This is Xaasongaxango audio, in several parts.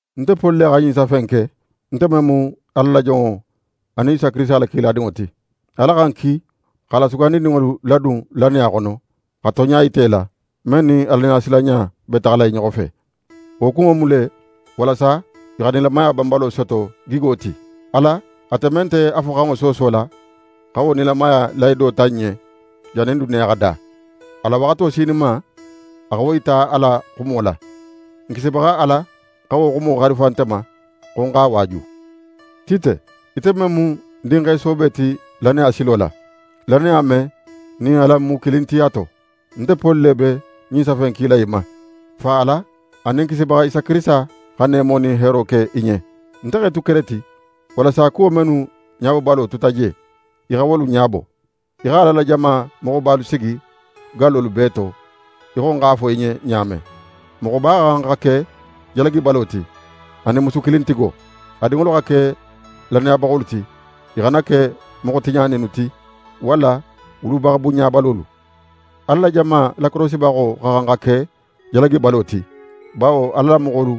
Nte Poli le xa ɲin safe in ke, nte men mu Ala la jonŋo anin Isa Kirisita la kiladinŋo ti. Ala xa ń ki x'a la sugandininŋolu ladun lannaya xono, xa tonɲa yita i la, men nin Alaɲasilanɲa be taxala i ɲoxo fe. Wo kunŋo mu le walasa i xa nilamaya banbalo soto gigo ti. Ala, ate men nte a foxanŋo soosola xa wo nilamaya lahido ta n ɲen, jannin duniya xa da. A la waxato sininma, a xa wo yita a la xumo la. N Kisibaxa Ala xa wo xumo xarifa nte ma, xo ń x'a waaju. Tite, ite men mu ń dinxe soobe ti lannaya silo la, lannaya men nin alan mu kilin ti a to, nte Poli le be ɲin safe in kila í ma. Fa Ala anin n Kisibaxa Isa Kirisita xa neemo nin heero ke í ɲen. Nte x'é tu Kereti, walasa kuwo mennu ɲabobalo tuta je, í xa wolu ɲabo. Í xa Ala la jama moxobalu sigi gallolu bee to, í xo ń x'a fo í ɲen ɲa men. Moxoba xa xan xa ke jalagibalo ti, anin musukilintigo. A dinŋolu xa ke lannayabaxolu ti, i xana ke moxo tiɲaninnu ti walla wulubaxa bunɲabalolu. Ala la jama lakorosibaxo xa xan xa ke jalagibalo ti, bawo Ala la moxolu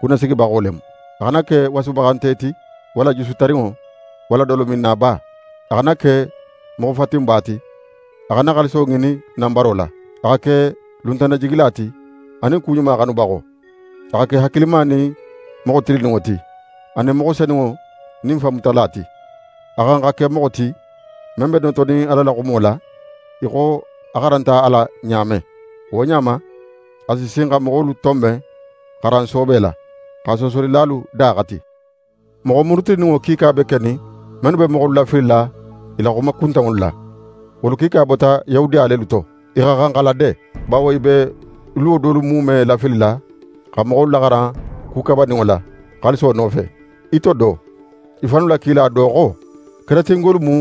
kunnasigibaxo le mu. A xana ke wasubaxante ti, walla jusu tarinŋo, walla dolominnaba. A xana ke moxo fatinba ti, a xana xaaliso ŋinin nanbaro la. A xa ke luntannajigila ti, anin ku ɲuma xanubaxo. A xa ke hakilima nin moxo tilinninŋo ti, anin moxo senunŋo nin fanmutala ti. A xa xan xa ke moxo ti, men be notonin Ala la xumo la, í xo a xaranta a la ɲa men. Wo ɲa ma, a si sin xa moxolu tonben xaran soobe la, xa soosolilalu da xati. Moxo murutininŋo kiika be kenin mennu be moxolu lafilila i la xuma kuntanŋolu la. Wolu kiika bota Yahudiya lelu to. I xa xan xa lade, bawo i be luwo dolu muume lafilila, xa moxolu xaran ku kabaninŋo la, xaaliso nofe. I to do, i fannu la kila do xo: «Keretingolu mu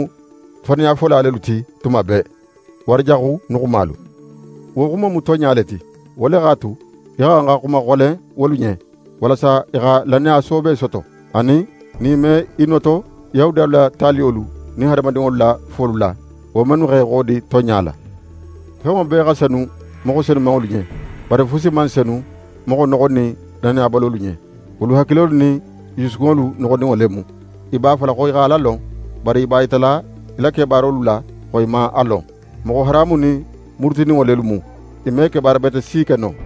faniyafola lelu ti tuma bee; wara jaxu nuxumalu.» Wo xumo mu tonɲa le ti. Wo le x'a tu, í xa xan xa xumaxolen wolu ɲen, walasa i xa lannaya soobe soto, anin, nin i me i noto Yahudiyalu la taliyolu nin hadamadinŋolu la folu la, wo mennu x'e xodi tonɲa la. Fenŋo bee xa senu moxo senumanŋolu ɲen; bari fusi man senu moxo noxonin lannabalolu ɲen. Wolu hakilolu nin i jusukunŋolu noxoninŋo le mu. I b'a fola xo i xa Ala lon, bari i b'a yitala i la kebaarolu la xo i man a lon. Moxo haramunin, murutininŋo lelu mu. I me kebaara bete si ke no.